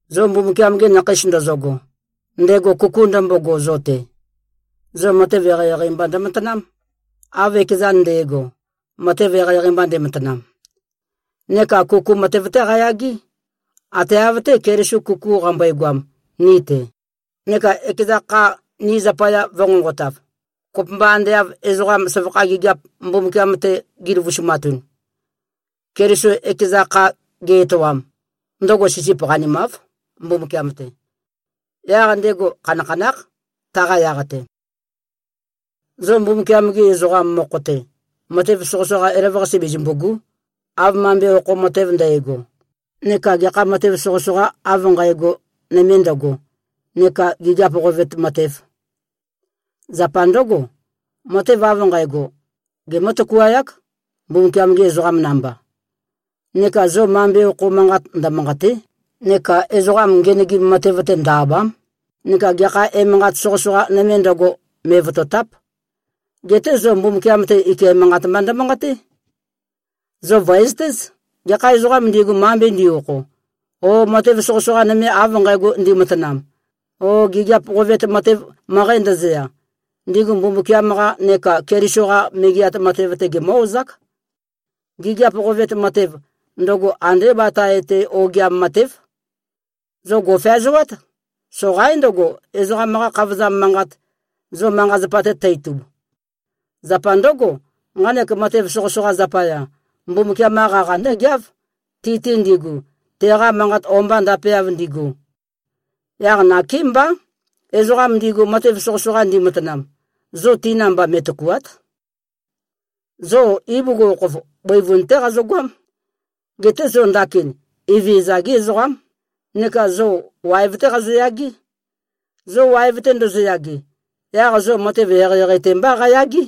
Zo Mbumbukiam-gi nakheis ndozogo, ndego kuku ndømbogo zo-te, zo matev eqeieqei mba ndømatanám, av ekezan nde꞉go, matev eqeieqei ndematanam. Neka kuku matev-té qayagé, ate av-té, Keliso kuku qambøegoam ni-te, neka ekeza kha ni zapaya vø̄nqonqotav, kopømba ande av ezoqa søvakha gigiap Mbumbukiam-te gi꞉løvusumatun. Keliso ekeza kha ge-etoam, ndøgo sisip qanimáv, Mbumbukiam-te. Yaq ndego khanakhanákh, taqa yaq-te. Zo Mbumbukiam-gi ezoqam mokho-te, matev soqøsoqa elavøqase bezømbù꞉gu᷄, av mambe okho matev ndægo neka gekha matev soqøsoqa av nqægo nøme ndøgo neka gigiap qovet matev. Zapa ndǿgo, matev av nqægo, gemǿ-tøkuayák, Mbumbukiam-gi ezoqam namba. Neka zo mambe okho manqat ndømanqàte᷄, neka ezoqam ngenøgim matev-te ndø-àba᷄m, neka gekha emanqat soqøsoqa nøme ndøgo, me꞉votòta᷄p. Geté zo Mbumbukiam-te, ike manqat mba ndømanqaté. Zo vø̀ezøtéz: Gekha ezoqām ndigu, mambe ndi-okho o matev soqøsoqa nøme av nqægo ndimatanam o gigiap qovet matev møqæ ndøzøya, ndigu Mbumbukiam-qa neka Keliso-qa Megeat Matev-te, gemǿ-ozák. Gigiap qovet matev, ndøgo andé batae-te ogiam matév. Zo gò꞉feazoát! Soqaín ndøgo, ezoqam-qa khavozam manqat, zo manqa-zapa-te tø-itub. Zapa ndǿgo, nqanek matev soqøsoqa zapaya, Mbumbukiam-qa qaqa ndǿgeáv, ti-te ndigu, teqa manqat o-mba ndapeav ndigu. Yaq nakémbá, ezoqam ndigu matev soqøsoqa ndimatanam, zo ti namba, me꞉tøkùa᷄t. Zo ibugukhokhof, bøivun-té qazogoám. Geté zo ndakin Evezøza-gí ezoqám neka zo waev-té qazoyagé. Zo waev-te ndozoyage, yaq zo matev eqeieqei-te mbá qayagé.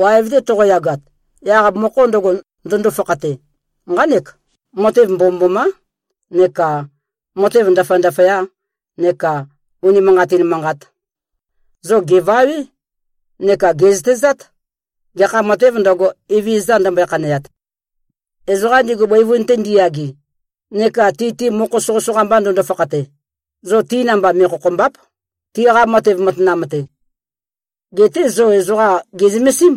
Waev-te toqoyagat, yaq mokho ndøgo, ndøndo-fakhate, nqánek: Matev mbomømbomá neka matev ndaføya-ndaføya neka unimanqatin manqat. Zo gèvawé neka gè꞉zøtezát, gekha matēv ndøgo, Evezøza ndømbøe-khaneat. Ezoqa ndigu bøivun-te ndiyage neka ti-te mokho soqøsoqa mba ndøndo-fakhate, zo ti namba, me꞉khokhòmba᷄p, tiqa matev matanam-te. Geté zo ezoqa gè꞉zømesím,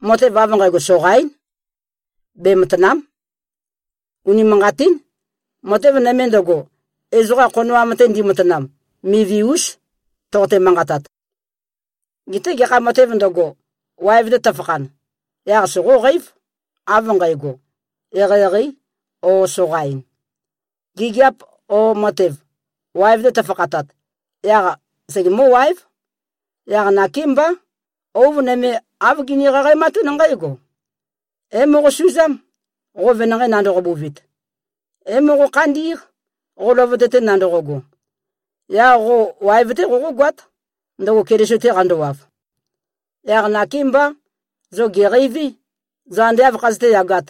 matev av nqægo soqaín. Bematàna᷄m. Unimanqatín, matev nøme ndøgo, ezoqa khonoam-te ndimatanam, mivi-ús, toqote-manqatat. Geté gekha matēv ndøgo, waev-te tøfakhan, yaq soqóqeív, av nqægo, eqeieqeī o soqain. Gigiap o matev, waev-te tøfakhatat, yaq segemǿ-waév. Yaq nakémbá, ouv nøme āv gini-qaqaematún nqǽgo, “É-moqosuzám, qo venanqei nandoqo-buvit. É-moqo-khandí꞉q, qo løvøte-te nandoqogo. Yaq qo waev-té qoqógoát, ndøgo Keliso-te qandowav.” Yaq nakémbá, zo gèqeiví, zo ande áv khazøté-yagāt.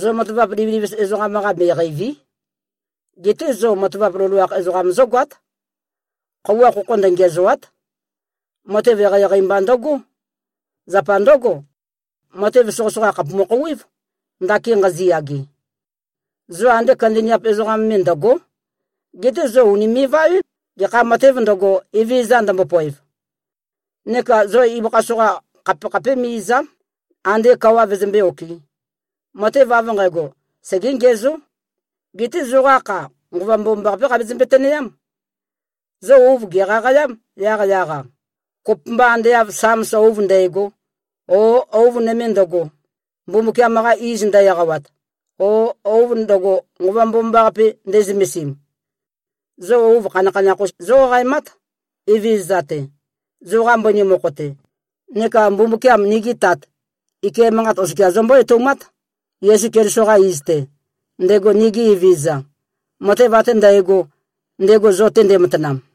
Zo matavap livilivis ezoqam-qa, me꞉qeìvi᷄. Geté zo matavap loloakh ezoqam zógoát. Khøuwa khokho ndøngiæzòa᷄t. Matev eqeieqei mba ndøgó. Zapa ndǿgo, matev soqøsoqa khàpumu-khouwév, ndakin nqaziyage. Zo ande kandaniap ezoqam me ndø̀go᷄. Geté zo ùnime꞉-vawé, gekha matēv ndøgo, Evezøza ndømbopoev. Neka zo ibøkha soqa khapekhapé me꞉-ìza᷄m, andé kawa vøzømbé-okɨ̄. Matev av nqægo, segé-ngiæzó. Geté zoqa kha, Nqova Mbomambaqapé qabezømbe-tønøyám. Zo ouv gèqaqayám, yaqyaq-a, kopømba ande av Sams ouv ndægo, o ouv nøme ndøgo, Mbumbukiam-qa iz ndø-eqawat, o ouv ndøgo, Nqova Mbomambaqape nde꞉zømesim. Zo ouv khanakhanakh-us zóqaqaemát, Evezøza-te, zoqa mbøni mokho-te. Neka Mbumbukiam, nigi Tat, ike manqat oskia zombó-etoumát, Yesu Keliso-qa iz-te, ndego nigi Evezøza, matev ate ndægo, ndego zo-te ndematanam.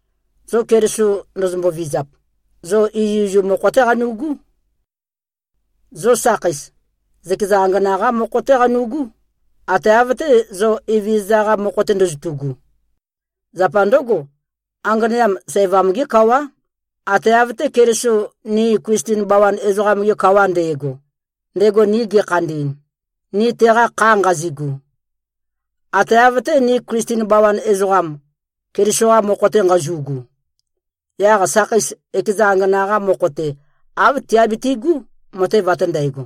Zo Keliso ndozombo-vizap, zo izuizum mokho-té qanu꞉gú. Zo sakheis, zøkeza angana-qá mokho-té qanu꞉gú, ate av-té, zo Evezøza-qa mokho-te ndozotu꞉gu. Zapa ndǿgo, anganeam sævam-gé kawá, ate av-té, Keliso ni Klisten bawan ezoqam-ge kawa nde꞉go, ndego ni gekhandi꞉n, ni teqa kha nqazigu. Ate av-té, ni Klisten bawan ezoqam, Keliso-qa mokho-te nqazu꞉gu, yaq sakheis ekeza angana-qa mokho-te, āv tiabitu꞉gú, matev ate ndægo.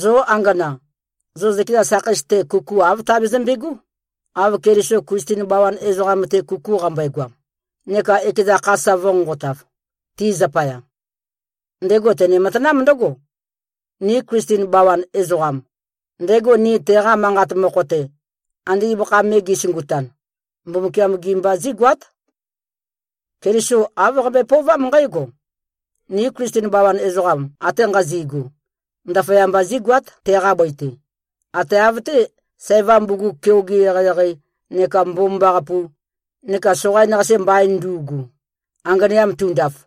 Zo angana, zo zøkeza sakheis-te, kuku āv tabezømbe꞉gó, av Keliso Klisten bawan ezoqam-te, kuku qambøegoam, neka ekeza kha sa vø̄nqonqotav, ti zapaya. Ndego tene-matanám ndǿgo: Ni Klisten bawan ezoqam, ndego ni teqa manqat mokho-te, ande ibøkha me ge꞉sungutan, Mbumbukiam-gi mba zígoát. Keliso āv qambøe-pøovám nqǽgo: Ni Klisten bawan ezoqam ate nqazi꞉gu, ndaføyamba zígoát, teqa bøi-te, ate av-té, sævam bugug keoge eqeieqei neka mbomambaqapu neka soqain-qase mbain ndu꞉gu, anganeam tundaf.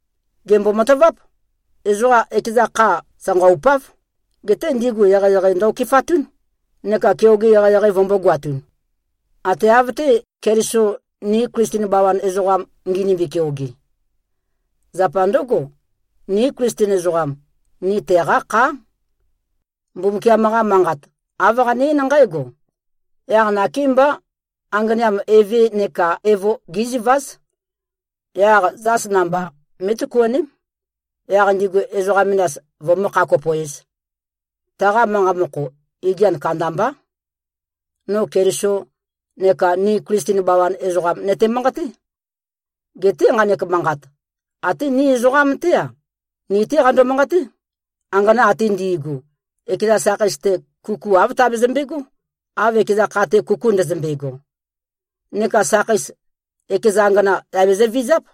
Gèmbo-mataváp: Ezoqa ekeza kha, sanqaupáv. Geté ndigu eqeieqei ndø-okefatún, neka keoge eqeieqei vømbōgoatun. Ate av-té, Keliso ni Klisten bawan ezoqam nginimbi-keoge. Zapa ndǿgo, ni Klisten ezoqam, ni teqá khá. Mbumbukiam-qa Manqat, āv qane-eín nqǽgo, “Yaq nakémbá, anganeam eve neka evo géziváz. Yaq zās namba mé꞉tøkuaném, yaq ndigu ezoqa menas, vømǿ-kha-kopo-ēz.” Taqa manqa mokho, igian kandambá. No Keliso neka ni Klisten bawan ezoqam nøte-manqaté. Geté nqanek manqat, até ni ezoqam-té-a, ni-té qando-manqaté. Angana ate ndi꞉gu, ekeza sakheis-te, kuku āv tabezømbe꞉gó, av ekeza kha-te kuku ndøzømbe꞉go. Neka sakheis, ekeza angana, yà bezøvizáp.